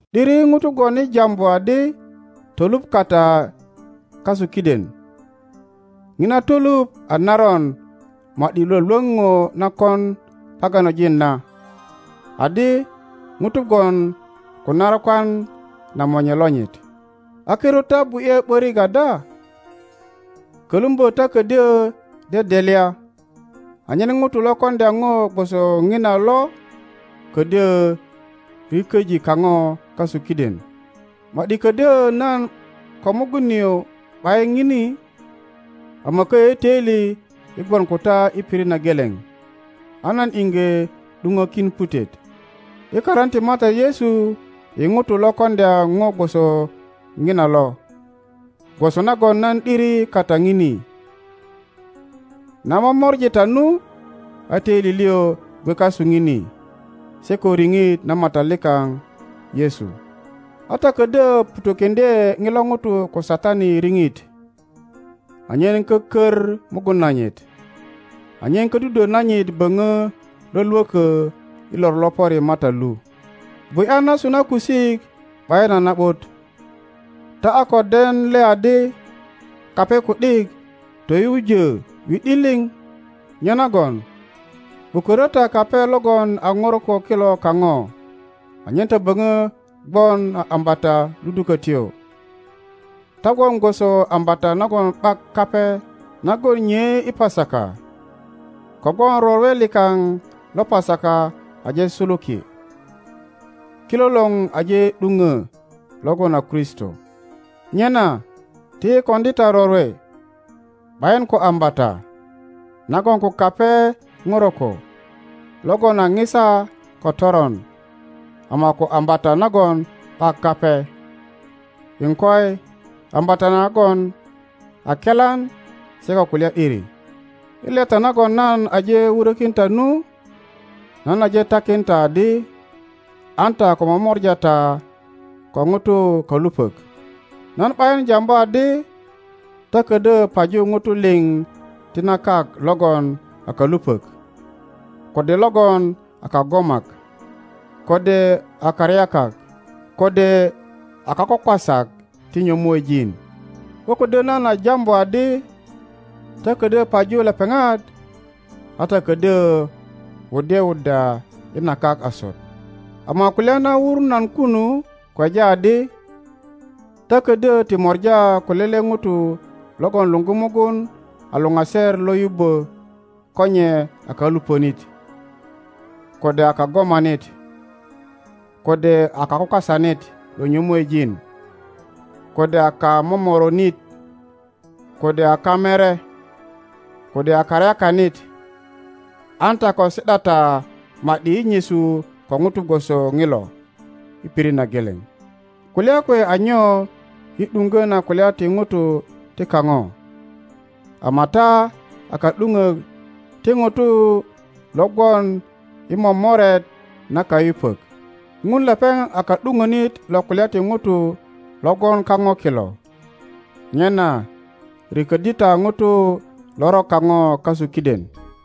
’Diri ŋutu gwon i jambu adi toluŋ kata kasu kiden; ŋina toluŋ a naron ma ’di Iwolwoŋ ŋo na kon paganojin na; adi ŋuto gwon ko narakwan na monye lonyit. A kirut ta bu ’ye ’börik ada? Kölumbö ta ködyö dedelya, anyen ŋuto lo koŋdya ŋo gwoso ŋina lo kodyö riköji kaŋo kasu kiden. Ma ’di ködyo nan ko mugun nio ’bayin ŋini, ama köyö i töili yi gwon ko ta i pirit na geleŋ, a nan iŋge ’duŋökin putet i karin ti Matat Yesu i ŋuto lo koŋdya ŋo gwoso ŋina lo, gwoso nagon nan ’diri kata ŋini. Na momori ta nu, a toili lio gwe kasu ŋini, se ko riŋit na Matat likaŋ Yesu, a ta ködyö ŋutö kiŋdye ŋilo ŋuto ko Satani i riŋit anyen kökör mugun nanyit, anyen ködudwö nanyit böŋö lwölwökö i lor lo pöri Matat lu. Bu ’ya nasu na kusik ’bayin a na ’but. Ta a ko den le adi kape ku ’dik toyujö wi ’di liŋ? Nyenagon ’bukörö ta kape logon a ŋoroko kilo kaŋo anyen ta böŋö gwon a ambata ludukötyo. Ta gwon gwoso ambata nagon ’bak kape nagon nyei i Pasaka; kogwon rorwe likaŋ lo Pasaka aje suluki, kilolor aje ’duŋö logon a Kristo. Nyena ti yi koŋdi ta rorwe, ’bayin ko ambata nagon ko kape poroko logon a ŋisa ko toron, ama ko ambata nagon ’bak kape, iŋkoi, ambata nagon a kelan se ko kulya ’diri. I leta nagon nan aje wurökin ta nu, nan aje takin ta adi, an ta ko momora ta ko Ŋutu kalupok. Nan ’bayin jambu adi ta ködyö paju Ŋutu liŋ ti na kak logon a kalupök, kode logon a kagomak, kode a karyakak, kode a kakwakwasak ti nyömuejin; ko ködyö nan a jambu adi ta kodyö paju lepeŋat, a ta ködyö wuddye wuddya i na kak asut. Ama kulya na wur nan kunu kweja adi, ta ködyö ti mora ko lele Ŋuto logon luŋgu mugun a luŋaser lo yubbö ko nye a kalupönit, kode a kagomanit, kode a kakwakwasanit lo nyömuejin, kode a kamomoronit, kode a kamere, kode a karyakanit. An ta ko si ’da ta ma ’di i nyesu ko Ŋuto gwoso ŋilo i pirit na geleŋ. Kulya kwe a nyo i ’duŋgö na kulya ti Ŋutu ti kaŋo? Ama ta a ka ’duŋok ti Ŋutu lo gwon i momoret na kayupök. Ŋun lepeŋ a ka ’duŋonit lo kulya ti Ŋutu lo gwon kaŋo kilo. Nyena riköddi ta ŋuto loron kaŋo kasu kiden.